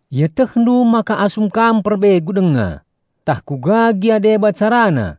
Ietehndu maka asum kam perbegu denga, tah kuga gia deba carana,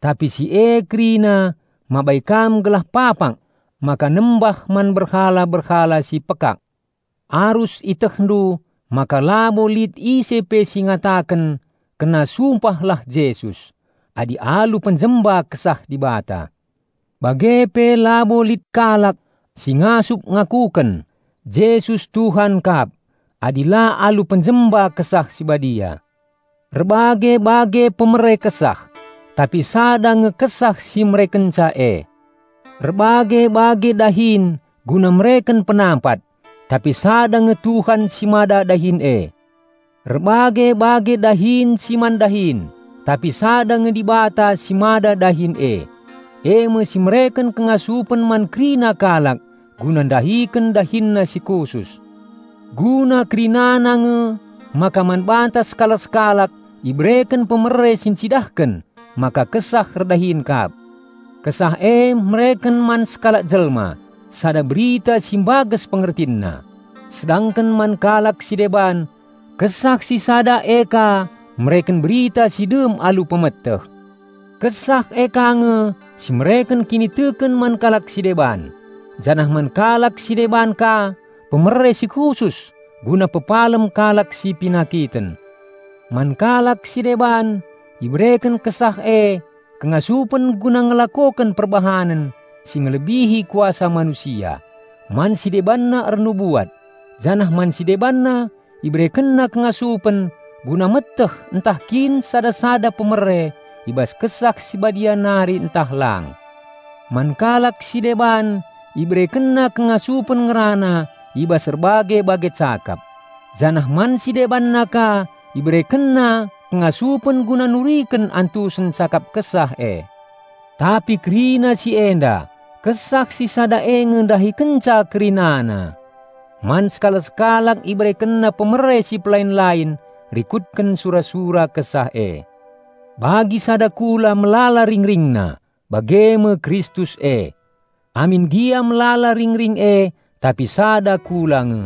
tapi si e kerina mabai kam gelah papak maka nembah man berhala-berhala si pekak. Arus ietehndu maka labo lit ise pe si ngataken, "Kena sumpahlah Jesus," adi alu penjemba Kesah Dibata. Bage pe labo lit kalak si ngasup ngakuken, "Jesus Tuhan kap," adi la alu penjemba Kesah Si Badia. Erbage-bage pemere Kesah, tapi sada nge Kesah si merekenca e. Erbage-bage dahin guna mereken penampat, tapi sada nge Tuhan si mada dahin e. Erbage-bage dahin si man dahin, tapi sada nge Dibata si mada dahin e, eme si mereken kengasupen man kerina kalak guna ndahiken dahinna si khusus. Guna kerinana nge maka man banta sekalak-sekalak ibereken pemere si ncidahken maka Kesah erdahin kap. Kesah e mereken man sekalak jelma sada berita si mbages pengertinna, sedangken man kalak si deban Kesah si sada e ka mereken berita si dem alu pemeteh. Kesah e ka nge si mereken kiniteken man kalak si deban, janah man kalak si deban ka pemere si khusus guna pepalem kalak si penakiten. Man kalak si deban ibereken Kesah e kengasupen guna ngelakoken perbahanen si ngelebihi kuasa manusia; man si debanna ernubuat; janah man si debanna IberekenNa kengasupen guna meteh ntah kin sada-sada pemere i bas Kesah Si Badia nari ntah lang. Man kalak si deban IberekenNa kengasupen ngerana i bas erbage-bage cakap, janah man si debanna ka IberekenNa kengasupen guna nuriken antusen cakap Kesah e. Tapi kerina si enda, Kesah si sada e nge ndahikenca kerinana. Man sekalak-sekalak IberekenNa pemere si pelain-lain rikutken sura-sura Kesah e. Bagi sada kula melala ringringna, bage me Kristus e. Amin gia melala ringring e, tapi sada kula nge.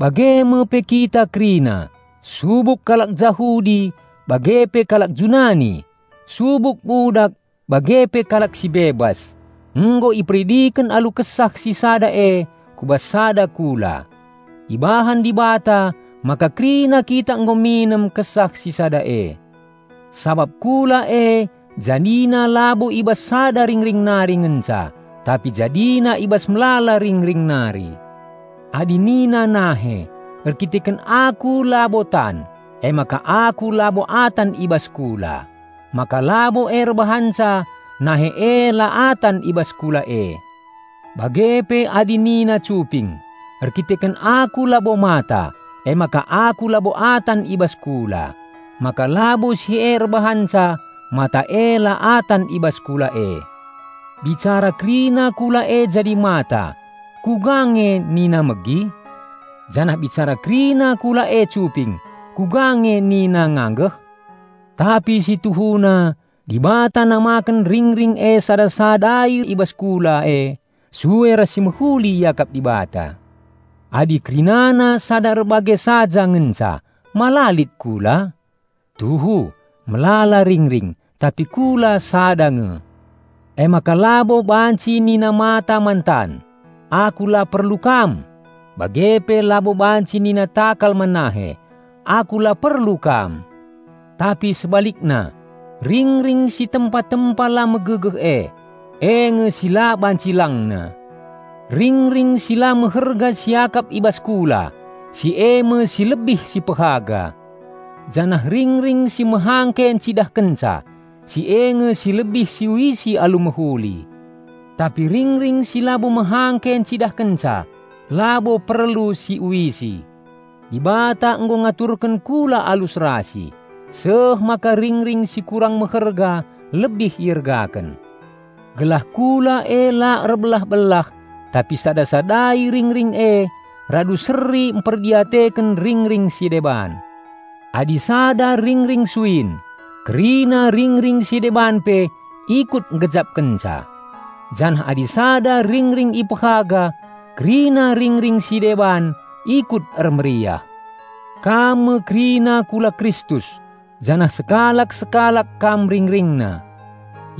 Bage me pe kita kerina, subuk kalak Jahudi bage pe kalak Junani, subuk budak bage pe kalak si bebas, nggo iperidiken alu Kesah si sada e ku bas sada kula. Ibahan Dibata maka kerina kita nggo minem Kesah si sada e. Sabap kula e jadina labo i bas sada ringring nari ngenca tapi jadina i bas melala ringring nari. Adi nina nahe, "Erkiteken aku labo tan, emaka aku labo atan i bas kula," maka labo e erbahanca nahe e la atan i bas kula e. Bage pe adi nina cuping, "Erkiteken aku labo mata, emaka aku labo atan i bas kula," maka labo si e erbahanca mata e la atan i bas kula e. Bicara kerina kula e jadi mata, kuga nge nina megi? Janah bicara kerina kula e cuping, kuga nge nina nganggeh? Tapi si tuhuna, Dibata namaken ringring e sada-sadai i bas kula e sue ras si mehuli iakap Dibata. Adi kerinana sada erbage saja ngenca, ma la lit kula? Tuhu, melala ringring, tapi kula sada nge. Emaka labo banci nina mata man tan, "Aku la perlu kam!" Bage pe labo banci nina takal man nahe, "Aku la perlu kam!" Tapi sebalikna, ringring si tempa-tempa la megegeh e, e nge si la banci langna. Ringring si la meherga siakap i bas kula, si eme si lebih sipehaga; janah ringring si mehangke encidahkenca, si e nge si lebih siuisi alu mehuli. Tapi ringring si labo mehangke encidahken labo perlu siuisi. Dibata nggo ngaturken kula alu serasi, seh maka ringring si kurang meherga lebih iergaken. Gelah kula e la erbelah-belah, tapi sada-sadai ringring e radu seri mperdiateken ringring si deban. Adi sada ringring suin, kerina ringring si deban pe ikut nggejapkenca. Janah adi sada ringring ipehaga, kerina ringring si deban ikut ermeriah. Kam me kerina kula Kristus janah sekalak-sekalak kam RingringNa.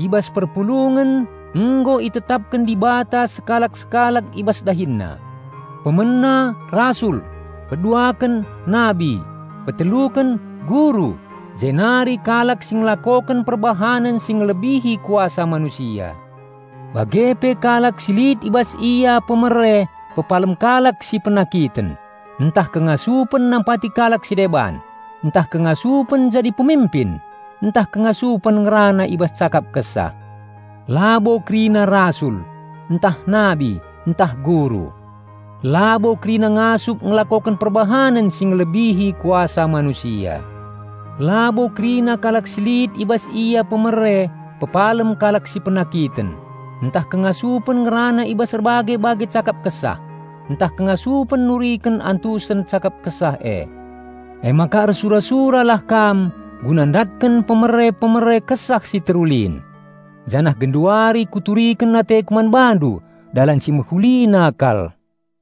I bas perpulungen nggo itetapken Dibata sekalak-sekalak i bas dahinna; pemena rasul, peduaken nabi, peteluken guru; jenari kalak si ngelakoken perbahanen si ngelebihi kuasa manusia, bage pe kalak si lit i bas ia pemere pepalem kalak si penakiten, ntah kengasupen nampati kalak si deban, ntah kengasupen jadi peminpin, ntah kengasupen ngerana i bas cakap Kesah. Labo kerina rasul, ntah nabi, ntah guru. Labo kerina ngasup ngelakoken perbahanen si ngelebihi kuasa manusia. Labo kerina kalak si lit i bas ia pemere pepalem kalak si penakiten, ntah kengasupen ngerana i bas erbage-bage cakap Kesah, ntah kengasupen nuriken antusen cakap Kesah e. Emaka ersura-suralah kam guna ndatken pemere-pemere Kesah si terulin. Janah genduari kuturiken ateku man bandu dalan si mehulina kal.